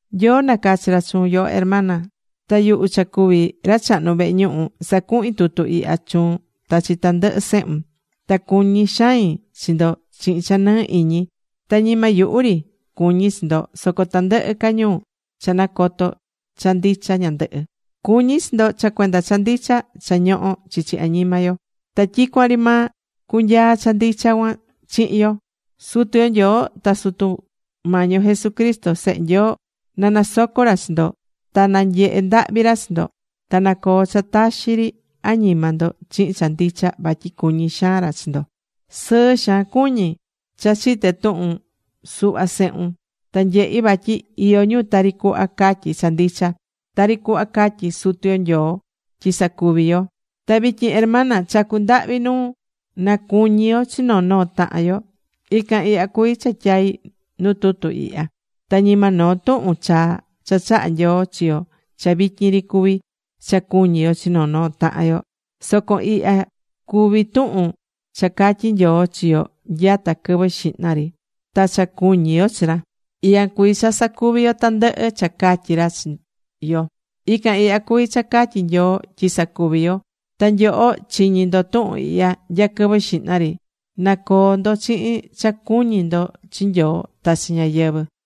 Nyoo nacachi̱ ra chuun, yoho Hermana. Ta yuhu cha cuví ra chahnu vehe ñuhu, sacuhín tutu ihya chuun ta chi tandɨhɨ sehun. Ta cuñí xain chi ndo chihin cha nɨɨ iñi. Ta ñima yuhu ri cuñí chi ndo soco tandɨhɨ ca ñu cha nacotó cha ndicha ñandɨhɨ. Cuñí chi ndo cha cuenda cha ndicha cha ñohó chichi añima yo. Ta tyicuan ri maa cunyaa cha ndicha cuan chihin yo. Sutu yo Nyoo ta Sutu Mañi yo Jesucristo Sehe Nyoo na nasoco ra chi ndo ta na nyehe ndahvi ra chi ndo. Ta na coo cha taxi ri añima ndo, chihin cha ndicha, vatyi cuñí xaan ra chi ndo. Sɨɨ xaan cuñí cha chité tuhun suhva sehun ta nyehí vatyi iyó ñu tari cuhva catyí cha ndicha, tari cuhva catyi̱ Sutu yo Nyoo tyi sacuvi yo. Ta vityin, Hermana, chacú ndahvi nuun, na cuñi yo chi noo noo tahan yo. Ican ihya cuví cha tyaí nu tutu ihya. Ta ñima noo tuhun chaa cha chaha̱ Nyoo chi yo cha vityin ri cuví cha cuñí yo chi noo noo tahan yo. Soco ican ihya cuví tuhun cha catyí Nyoo chi yo nyata quɨvɨ xihna ri. Ta cha cuñí yo chi ra, ican cuví cha sacuví yo tandɨhɨ cha catyí ra chi yo. Ican ihya cuví cha catyi Nyoo tyi sacuvi yo. Ta nyoho, chiñi̱ ndo tuhun ihya nya quɨvɨ xihna ri. Na coo ndo chihin cha cuñí ndo chi Nyoo ta chi ñáyɨvɨ.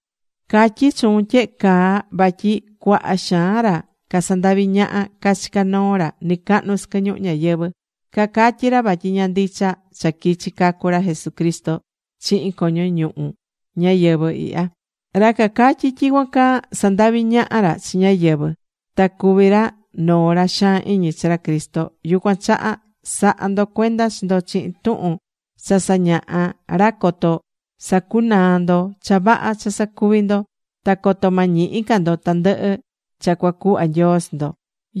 Catyí chuun tyehe caa vatyi cuaha xaan ra casandaví ñaha cachicá noo ra nɨcahnu sɨquɨ ñuhu ñayɨvɨ̱. Cacatyí ra vatyi ña ndicha cha quichi cacu ra Jesucristo chihin coño ñuhu ñayɨvɨ̱ ihya. Ra cacatyí tyicuan caa, sandaví ñaha ra chi ñáyɨvɨ. Ta cuví ra noo ra xaan iñi chi ra Cristo. Yucuan chaha, sa̱ha ndo cuenda chi ndo chihin tuhun cha sañahá ra coto sacunaa ndo cha vaha cha sacuví ndo, ta coto ma ñihi ca ndo tandɨhɨ cha cuacuhva Nyoo chi ndo.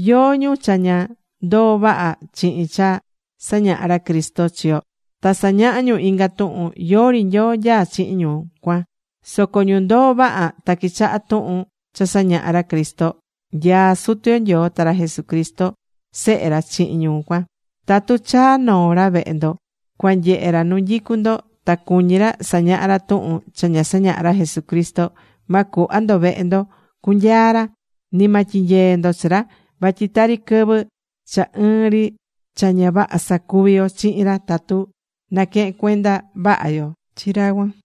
Yóó ñu cha ña ndoó vaha chihin cha sañahá ra Cristo chi yo ta sañahá ñu inga tuhun, yori Nyoo nyaá chihin ñu cuan. Soco ñu ndoó vaha ta quichahá tuhun cha sañahá ra Cristo, nyaá Sutu yo Nyoo ta ra Jesucristo Sehe ra chihin ñu cuan. Tatu chaa noo ra vehe ndo, cua nyehe ra nu nyicú ndo ta cuñí ra sañaha ra tuhun cha ña sañaha̱ ra Jesucristo, ma cuhva ndo vehe ndo cunyaa ra, ni ma tyinyee ndo chi ra. Vatyi tari quɨvɨ cha ɨɨn ri cha ña vaha sacuví yo chihin ra tatu naquehén cuenda vaha yo chi ra cuan.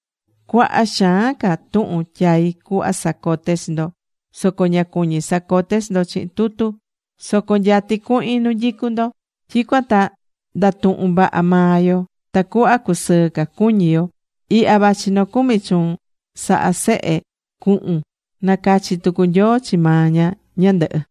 Cuaha xaan ca tuhun tyaí cuhva sacote chi ndo, soco ña cuñí sacote chi ndo chihin tutu. Soco nyatí cuhin nu nyicú ndo. Tyicuan ta ndatuhun vaha maa yo, tacuhva cusɨɨ ca cuñi yo. Ihya vachi nocumi chuun sahá sehe cuhun. Nacachi̱ tucu Nyoo chi maa ña ñandɨhɨ.